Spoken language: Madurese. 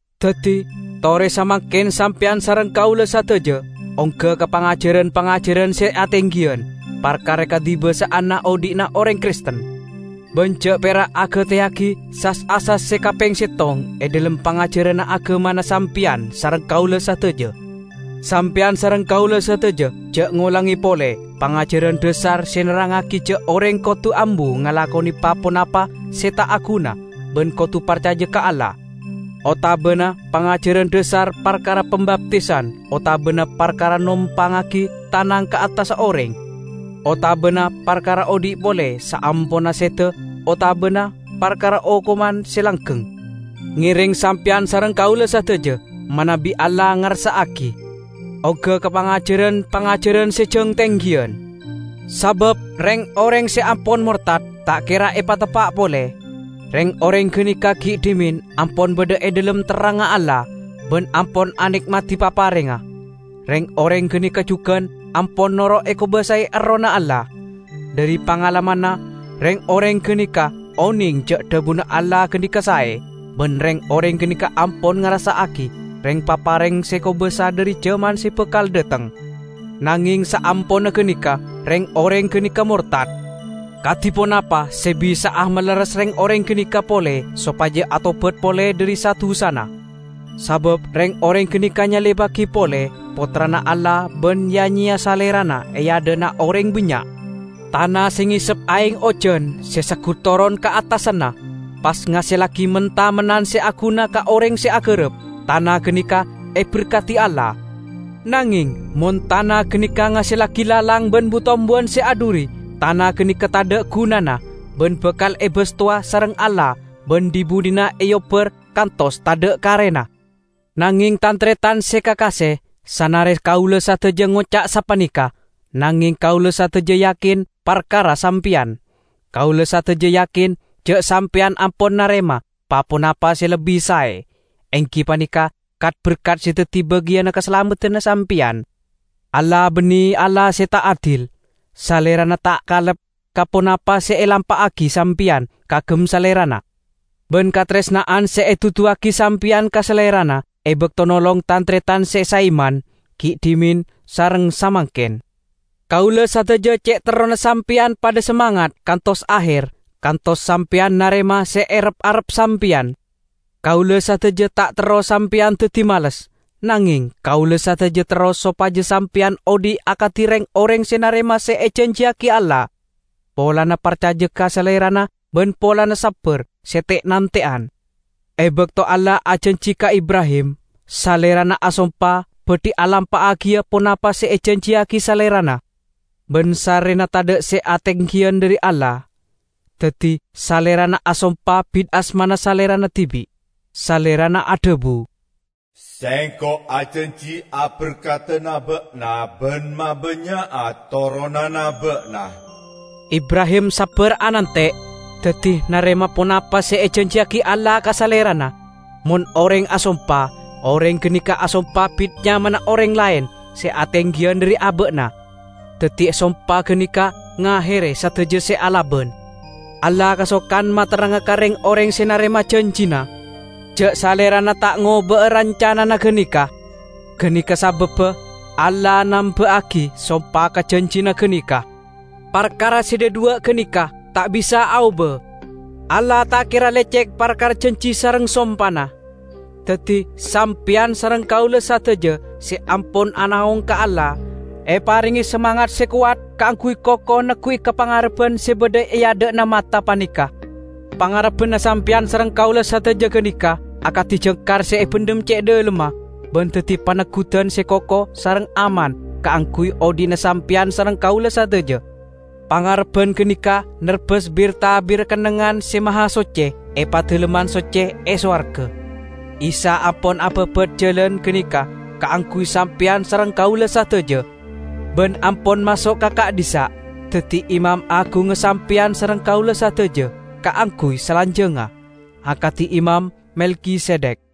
Daddi tore samangken sampeyan sareng kaula sadaja ongga ka pangajaran-pangajaran se atenggiyan parkara kadibasa'anna odhi'na oreng Kristen, ban ja' pera' agateyagi sas-asas se kapeng settong e dhalem pangajaranna agamana sampeyan sareng kaula sadaja. Sampeyan sareng kaula sadaja ja' ngolange pole pangajaran dhasar se nerrangngagi ja' oreng kodu ambu ngalakone pa-ponapa se ta' aguna ban kodu parcaja ka Allah, otabana pangajaran dhasar parkara pambaptisan otabana parkara nompangngagi tanang ka attassa oreng, otabana parkara odhi' pole saamponna seda otabana parkara okoman se langgeng. Ngereng sampeyan sareng kaula sadaja, manabi Allah ngarsa'agi, ongga ka pangajaran-pangajaran se jang tenggiyan! Sabab, reng-oreng se ampon mortad ta' kera epateppa' pole. Reng-oreng ganeka gi' dhimen ampon badha e dhalem terrangnga Allah, ban ampon ane'madi paparengnga. Reng-oreng ganeka jugan ampon noro' ekobasae Errohna Allah. Dhari pangalamanna, reng-oreng ganeka oneng ja' dhabuna Allah ganeka sae, ban reng-oreng ganeka ampon ngarassa'agi reng-papareng se kobasa dhari jaman se bakal dhateng. Nangeng saamponna ganeka, reng-oreng ganeka mortad! Kadi ponapa se bisa'a malerres reng-oreng ganeka pole sopaja atobat pole dhari sa-dusana. Sabab reng-oreng ganeka nyalibbagi pole Pottrana Allah ban ya-nyeya Salerana e adha'na oreng bannya'. Tana se ngesep aeng ojan se seggut toron ka attasanna, pas ngasellagi men-tamennan se aguna ka oreng se agarap, tana ganeka eberkadi Allah. Nangeng mon tana ganeka ngasellagi lalang ban bu-tombuwan se adhuri, tana ganeka tadha' gunana, ban bakal ebastowa sareng Allah ban dhi-budhina eobbar kantos tadha' karena. Nangeng tan-taretan se kakase, sanare kaula sadaja ngoca' sapaneka, nangeng kaula sadaja yakin parkara sampeyan. Kaula sadaja yakin ja' sampeyan ampon narema pa-ponapa se lebbi sae, enggi paneka kat-berkat se daddi bagiyanna kasalameddanna sampeyan. Allah banne Allah se ta' adil. Salerana ta' kalep ka ponapa se elampa'agi sampeyan kaagem Salerana, ban kataresna'an se eduduwagi sampeyan ka Salerana e bakto nolong tan-taretan se saiman, gi' dhimen sareng samangken. Kaula sadaja ce' terrona sampeyan padha samangat kantos aher, kantos sampeyan narema se erep-arep sampeyan. Kaula sadaja ta' terro sampeyan daddi males. Nangeng kaula sadaja terro sopaja sampeyan odhi' akadi reng-oreng se narema se ejanjiyagi Allah, polana parcaja ka Salerana ban polana sabbar se te'-nante'an. E bakto Allah ajanji ka Ibrahim, Salerana asompa badhi alampa'agiya ponapa se ejanjiyagi Salerana. Ban sarrena tadha' se atenggiyan dhari Allah, daddi Salerana asompa bit asmana Salerana dibi'. Salerana adhabu, "Sengko' ajanji aberkadana ba'na ban mabannya'a toronanna ba'na." Ibrahim sabbar anante', daddi narema ponapa se ejanjiyagi Allah ka Salerana. Mon oreng asompa, oreng ganeka asompa bit nyamana oreng laen se atenggiyan dhari aba'na, daddi sompa ganeka ngahere sadaja se alaban. Allah kasokan materranga ka reng-oreng se narema janjina, ja' Salerana ta' ngoba'a rancanana ganeka. Ganeka sababba Allah namba'agi sompa ka janjina ganeka. Parkara se dhadhuwa' ganeka ta' bisa aoba: Allah ta' kera lecek parkara janji sareng sompana. Daddi, sampeyan sareng kaula sadaja se ampon anaong ka Allah, eparenge samangat se kowat kaangguy koko neggu'i ka pangarebban se badha e adha'na mata paneka. Pangarebbanna sampeyan sareng kaula sadaja ganeka akadi jangkar se ebendhem ce' dhalemma ban daddi paneggudan se koko sareng aman kaangguy odhi'na sampeyan sareng kaula sadaja. Pangarebban ganeka nerbas bir-tabirra Kennengngan Se Mahasocce e Padalemman Socce e sowarga. Isa ampon ababat jalan ganeka kaangguy sampeyan sareng kaula sadaja, ban ampon maso' ka ka'dhissa' daddi Imam Agungnga sampeyan sareng kaula sadaja kaangguy salanjangnga, akadi Imam Melkisedek.